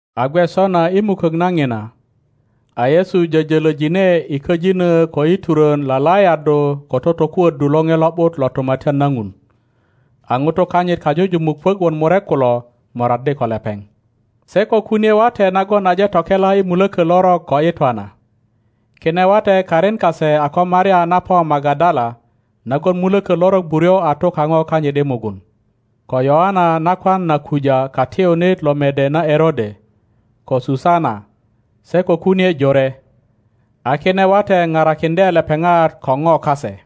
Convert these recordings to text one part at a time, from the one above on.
A gwe sona i mukök na ŋina, a yesu jöjölöjine i köjinö ko i turön lalajaddu ko totokuöddu Loŋe Lo ’but lo Tumatyan na Ŋun. A ŋutu kanyit kajujumuk puök wot murek kulo moraddi ko lepeŋ, se ko kunie wate nagon aje tokela i mulökö lorok ko i twana. Kine wate karin kase a ko Maria na po Magadala nagon mulökö lorok buryo a tu kaŋo kanyit i mugun; ko Yöana nakwan na Kuja katiyunit lo mede na Erode; ko Susana, se ko kunie jore. A kine wate parakiŋdye lepeŋat ko ŋo kase.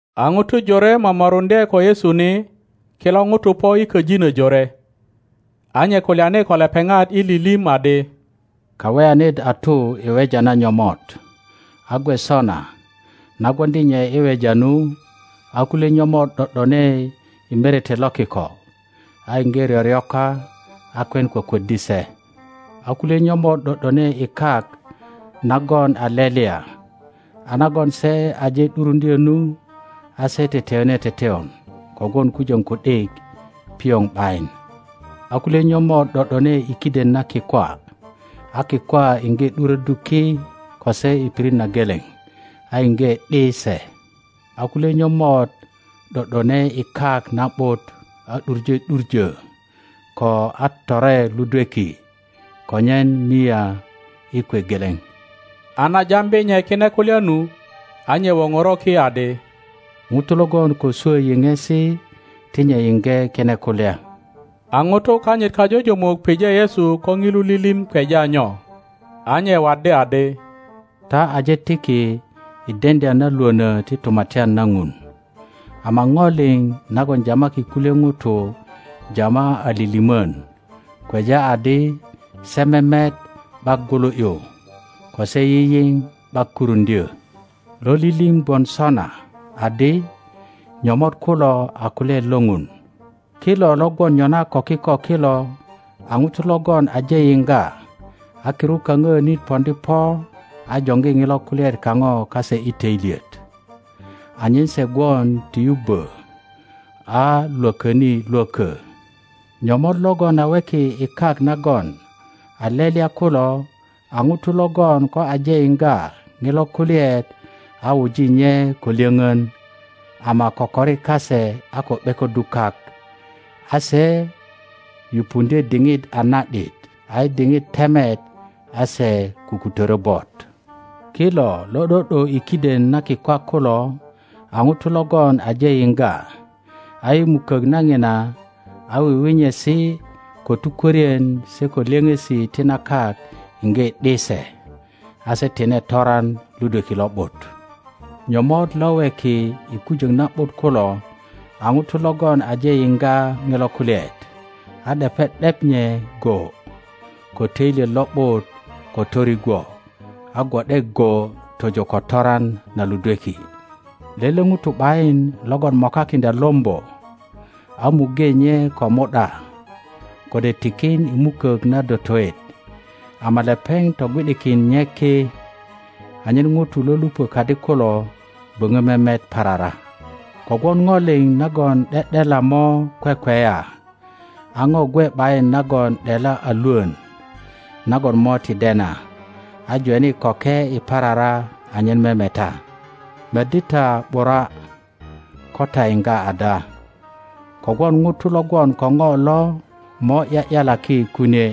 A ŋutu jore momoruŋdye ko Yesu ni; kilo ŋutu po i köjinö jore. A nye kulyani ko lepeŋat i lilim adi, Kaweyanit a tu i weja na nyomot. A gwe sona, na gwoŋdi nye i weja nu, a kulye nyomot ’do ’done i merete lo kiko, a iŋge ryoryoka, a kwen kwökwöddi se. A kulye nyomot ’do ’done i kak nagon a lelya, a nagon se aje ’duruŋdyö nu, a se teteyone teteyon kogwon kujöŋ ku ’dik pioŋ ’bayin. A kulye nyomot ’do ’done i kiden na kikwa, a kikwa iŋge ’duröddu ki ko se i pirit na geleŋ a iŋge ’di se. A kulye nyomot ’do ’done i kak na ’but a ’duŋe ’duŋö ko a tore ludweki, konyen mia i kwe geleŋ. A na jambi nye kine kulya nu, a nye woŋoro ki adi, Ŋuto logon ko swö yiŋesi ti nye yiŋge kine kulya. A ŋutu kanyit kajujumuk pije Yesu ko ŋilu lilim kweja nyo. A nye waddi adi, Ta aje tiki i deŋdya na lwönö ti Tumatyan na Ŋun, ama ŋo liŋ nagon jamaki kulye ŋutu jama a lilimon, kweja adi se memet ’bak gwulu ’yu, ko se yiyiŋ ’bak kuruŋdyö. Lo lilim gwon sona adi, Nyomot kulo a kulyaet lo Ŋun. Kilo lo gwon nyona ko kiko kilo a ŋutu logon aje yiŋga, a kirut kaŋöönit poŋdi poa joŋgi ŋilo kulyaet kaŋo kase i töilyet, anyen se gwon ti yubbö a lwököni lwökö. Nyomot logon a weki i kak nagon a lelya kulo a ŋutu logon ko aje yiŋga ŋilo kulyaet a wuji nye ko lyöŋön, ama kokori kase a ko ’bekoddu kak; a se yupundye diŋit a na ’dit, a i diŋit temet a se kukutörö bot. Kilo lo ’do ’do i kiden na kikwa kulo a ŋutu logon aje yiŋga, a i mukök na ŋina, a wiwinyesi ko tukwörien se ko lyöŋesi ti na kak iŋge ’di se, a se tine toran ludweki lo ’but. Nyomot lo weki i kujöŋ na ’but kulo a ŋutu logon aje yiŋga ŋilo kulyaet, a ’depe ’dep nye go ko töilyet lo ’but ko torigwo, a gwo ’de go tojo ko toran na ludweki. Lele ŋuto ’bayin logon mokakindya lombo a muŋge nye ko mu ’da, kode tikin i mukök na dotoet, ama lepeŋ togwi ’dikin nye ki, anyen ŋutu lo lupö kadi kulo böŋö memet parara. Kogwon ŋo liŋ nagon ’de ’dela mo kwekweya, a ŋo gwe ’bayin nagon ’dela a lwön nagon mo ti dena a jweni köke i parara anyen memeta. Meddi ta ’bura ko ta yiŋga ada, kogwon ŋuto lo gwon ko ŋo lo mo ’ya ’yalaki kunie,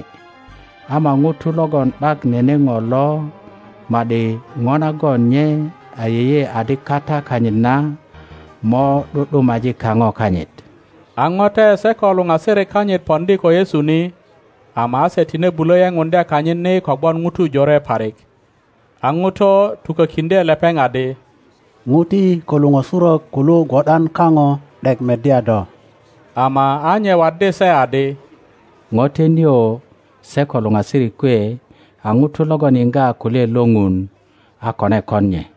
ama ŋuto logon ’bak nene ŋo lo ma ’di ŋo nagon nye ayeye adikata kanyit na mo ’du ’dumaji kaŋo kanyit. A ŋote se ko luŋasirik kanyit poŋdi ko Yesu ni, ama a se tine bulö yepuŋdya kanyit ni kogwon ŋutu jore parik. A ŋuto tukökiŋdye lepeŋ adi, ŋuti ko luŋösurök kulu gwo ’dan kaŋo ’dek meddya do. Ama a nye waddi se adi, Ŋote nio se ko luŋasirik kwe a ŋutu logon yiŋga kulyaet lo Ŋun a kone kon nye.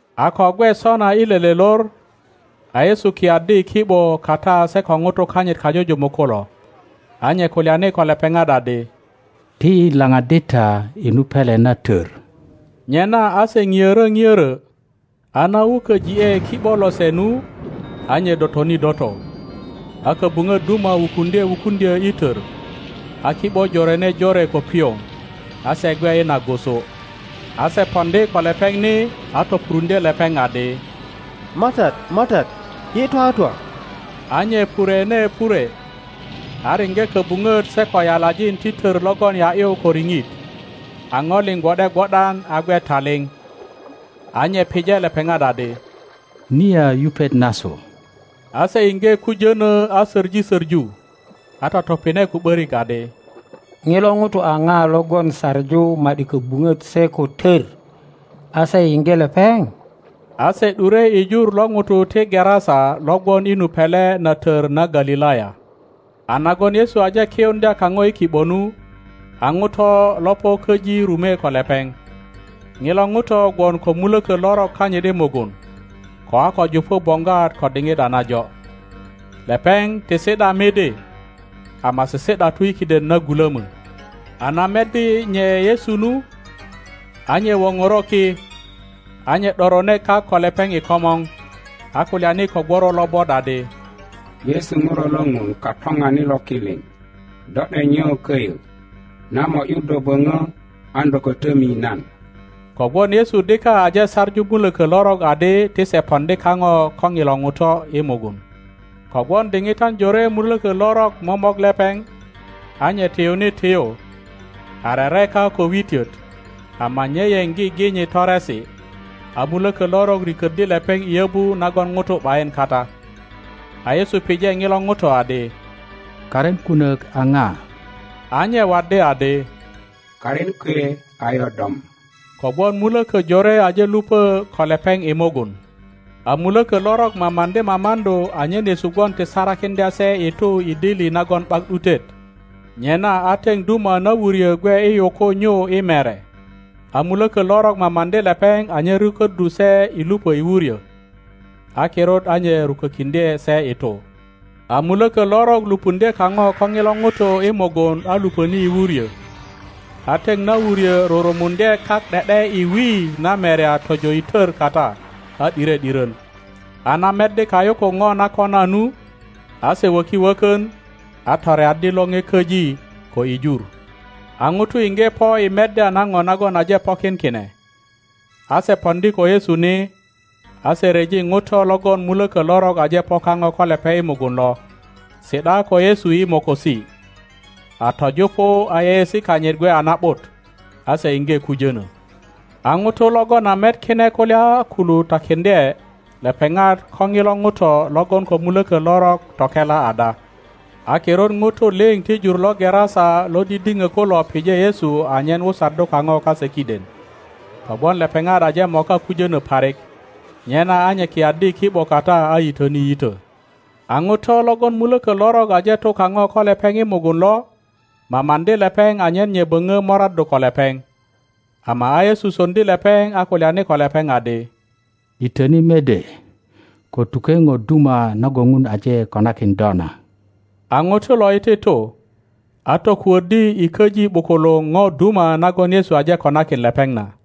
A ko gwe sona i lele lor, a Yesu kiyaddi i ki ’bo kata se ko ŋutu kanyit kajujumuk kulo, a nye kulyani ko lepeŋat adi, Ti yi laŋaddi ta i nu pele na tör. Nyena a se ŋiörö ŋiörö, a na wuköji ’e ki ’bo lose nu, a nye dotoni doto. A köbuŋöt duma wukuŋdye wukuŋdyö i tör, a ki ’bo jorene jore ko pioŋ, a se gwe i nagusu. a se poŋdi ko lepeŋ ni, a topuruŋdye lepeŋ adi, MATAT, MATAT, yi twatwa! A nye purwene purwe, a riŋge köbuŋöt se ko yalajin ti tör logon ya ’yu ko riŋit; a ŋo liŋ gwo ’de gwo ’dan a gwe taliŋ. a nye pije lepeŋat adi, Niya yupet nasu? A se iŋge kujönö a söŋi söŋu, a totopine ko ’börik adi, Ŋilo ŋuto a ŋa logon saŋu ma ’di köbuŋöt se ko tör, a se yiŋge lepeŋ? A se ’dure i jur lo ŋutu ti Gerasa lo gwon i nu pele na tör na Galilaya.A nagon Yesu aje kiyuŋdya kaŋo i ki ’bo nu, a ŋuto lo po köji rume ko lepeŋ. Ŋilo ŋuto gwon ko mulökö lorok kanyit i mugun, ko a ko jupu boŋgwat ko diŋit a najo. Lepeŋ ti si ’da midi, ama sisi ’datu i kiden na gulömö. A na meddi nye Yesu nu, a nye wonoro ki, a nye ’dorone kak ko lepeŋ i komor, a kulyani ko gworo lobot adi, Yesu, ŋuro lo ŋun Katoŋanit lo ki liŋ, do ’dek nyo koyo? Nan mo ’yu do bono, an do ko tomi nan. Kogwon Yesu dika aje saŋu muloko lorok adi ti se poŋdi kapo ko ŋilo ŋuto i mugun. (Kogwon diŋitan jore muloko lorok momok lepeŋ; a nye tiyuni tiyu, a rereka ko witiot, ama nye yen giginyi toresi, a mulökö lorok riköddi lepeŋ i yobu nagon nutu ’bayin kata.) A Yesu pije nilo nuto adi, Karin kunok a na? A nye waddi adi, Karin kwe a Yodom; kogwon muloko jore aje lupö ko lepeŋ i mugun. A muloko lorok mamaŋdi mamaŋdu anyen Yesu gwon ti sarakiŋdya se i tu i dili nagon ’bak ’dutet. Nyena a teŋ duma na wuryo gwe i yuku nyu i mere; a muloko lorok mamaŋdi lepeŋ anyen rukoddu se i lupö i wuryo. A kirut a nye rukokiŋdye se i tu. A muloko lorok lupuŋdye kano ko nilo nuto i mugun a lupöni i wuryo, a teŋ na wuryo rurumuŋdye kak ’de ’de i wi na merya tojo i tor kata, a ’dire ’diron. A na meddi kayukuk no na kona nu, a se woki wokon, a toreaddi lone köji ko i jur. A nutu inge po i meddya na no nagon aje pokin kine, a se poŋdi ko Yesu ni, a se ryeji nuto logon muloko lorok aje po kano ko lepeŋ i mugun lo, si ’da ko Yesu i mokosi, a töjupu a yeyeesi kanyit gwe a na ’but; a se inge kujönö. A nutu logon a met kine kulya kulu takiŋdye lepeŋat ko nilo nuto logon ko muloko lorok tokela ada. A kirut nutu liŋ ti jur lo Gerasa lo didino kulo pije Yesu anyen wusaddu kano kase kiden; kogwon lepeŋat aje moka kujono parik; nyena a nye kiyaddi i ki ’bo kata a yitöni yito. a nuto logon muloko lorok aje tu kano ko lepeŋ i mugun lo, mamaŋdi lepeŋ anyen nye bono moraddu ko lepeŋ; ama a Yesu soŋdi lepeŋ a kulyani ko lepeŋ adi, Yitöni mede, ko tuke no duma nagon pun aje konakin do na. A nuto lo iti tu, a tokudddi i köji ’bukuluŋ no duma nagon Yesu aje konakin lepeŋ na.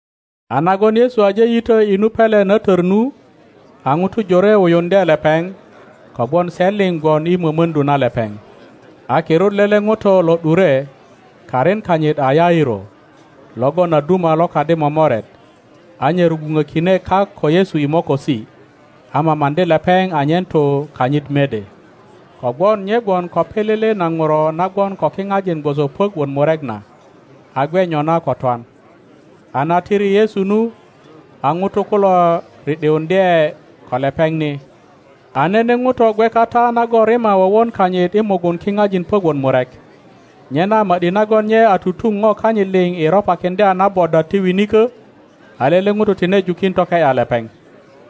A nagon Yesu aje yito i nu pele na tör nu, a nutu jore wuyuŋdye lepeŋ, kogwon se liŋ gwon i mömöŋdu na lepeŋ. A kirut lele ŋuto lo ’dure, karin kanyit a Yairo, logon a duma lo kadi momoret, a nye rugwunokine kak ko Yesu i mokosi, a mamaŋdi lepeŋ anyen tu kanyit mede, kogwon nye gwon ko pilili na nuro na gwon ko kinajin gwoso puök wot murek na, a gwe nyona ko twan. A na tiri Yesu nu, a nutu kulo ri ’diundye ko lepeŋ ni. a nene ŋuto gwe kata nagon rima wowon kanyit i mugun kinajin puök wot murek, nyena ma ’di nagon nye a tutun no kanyit liŋ i ropakiŋdya na bodwat ti winiko, a lele ŋuto tine jukin toke ’ya lepeŋ.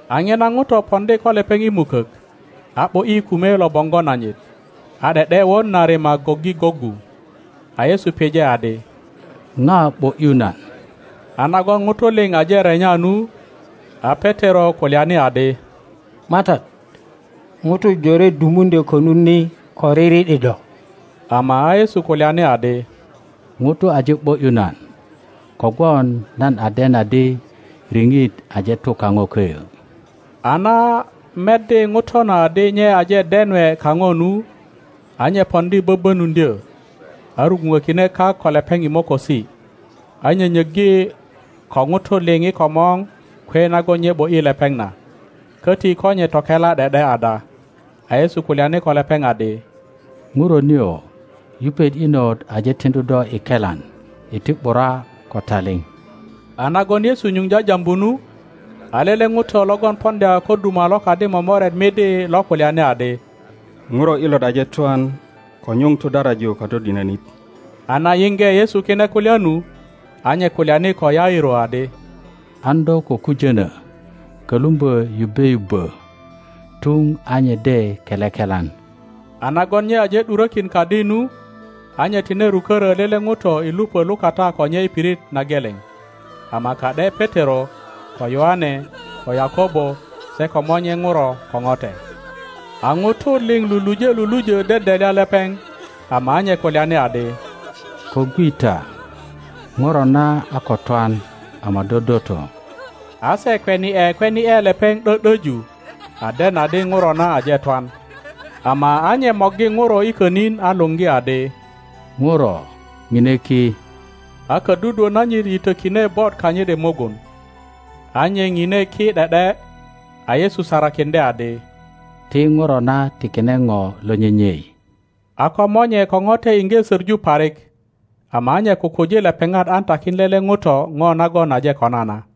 A nina ŋuto poŋdi ko lepeŋ i mukok, a ’bo ’yi kume lo boŋgo nanyit; a ’de ’de won na rima goggi goggu. a Yesu pije adi, ŋa ’bo ’yu nan? A nagon nutu liŋ aje renya nu, a Petero kulyani adi, MATAT, nutu jore dumuŋdyo konut ni ko riri ’di do! Ama a Yesu kulyani adi, Ŋuto aje ’bo ’yu nan; kogwon nan a den adi riŋit aje tu kano köyö. a na meddi ŋuto na adi nye aje denwe kano nu, a nye poŋdi böböpuŋdyö, a rugwunökine kak ko lepeŋ i mokosi, a nyönyöggi ko nutu liŋ i komor kwe nagon nye ’bo ’yi lepeŋ na, köti ko nye tokela ’de ’de ada. A Yesu kulyani ko lepeŋ adi, Ŋuro nio, yupet inot aje tiŋdu do i kelan; iti ’bura ko taliŋ. A nagon Yesu nyuŋ jajambu nu, a lele ŋuto logon poŋdya ko duma lo kadi momoret midi lo kulyani adi, Ŋuro inot aje twan; ko nyuŋ tudaraju Katodinönit. a na yinge Yesu kine kulya nu, a nye kulyani ko Yairo adi, An do ko kujönö; kölumbö yubbe yubbö tun a nye de kele kelan. A nagon nye aje ’durökin kadi nu, a nye tine rukörö lele ŋuto i lupö lukata ko nye i pirit na gelen, ama ka ’de Petero, ko Yoane, ko Yakobo, se ko monye nuro ko note. A nutu liŋ luluje lulujö dedelya lepeŋ; ama a nye kulyani adi, Ko gwi ta; nuro na a ko twan ama dodoto. A se kweni ’e kweni ’e lepeŋ ’dö ’döju, a den adi ŋuro na aje twan. Ama a nye morgi nuro i könin a luŋgi adi, Ŋuro, nine ki. a ködudwö nanyit yitökine bot kanyit i mugun, a nye nine ki ’de ’de; a Yesu sarakiŋdye adi, ti nuro na tikine po lo nyenyei. a ko monye ko note inge söŋu parik;-ama a nye kukuji lepeŋat an takin lele ŋuto ŋo nagon aje kona na.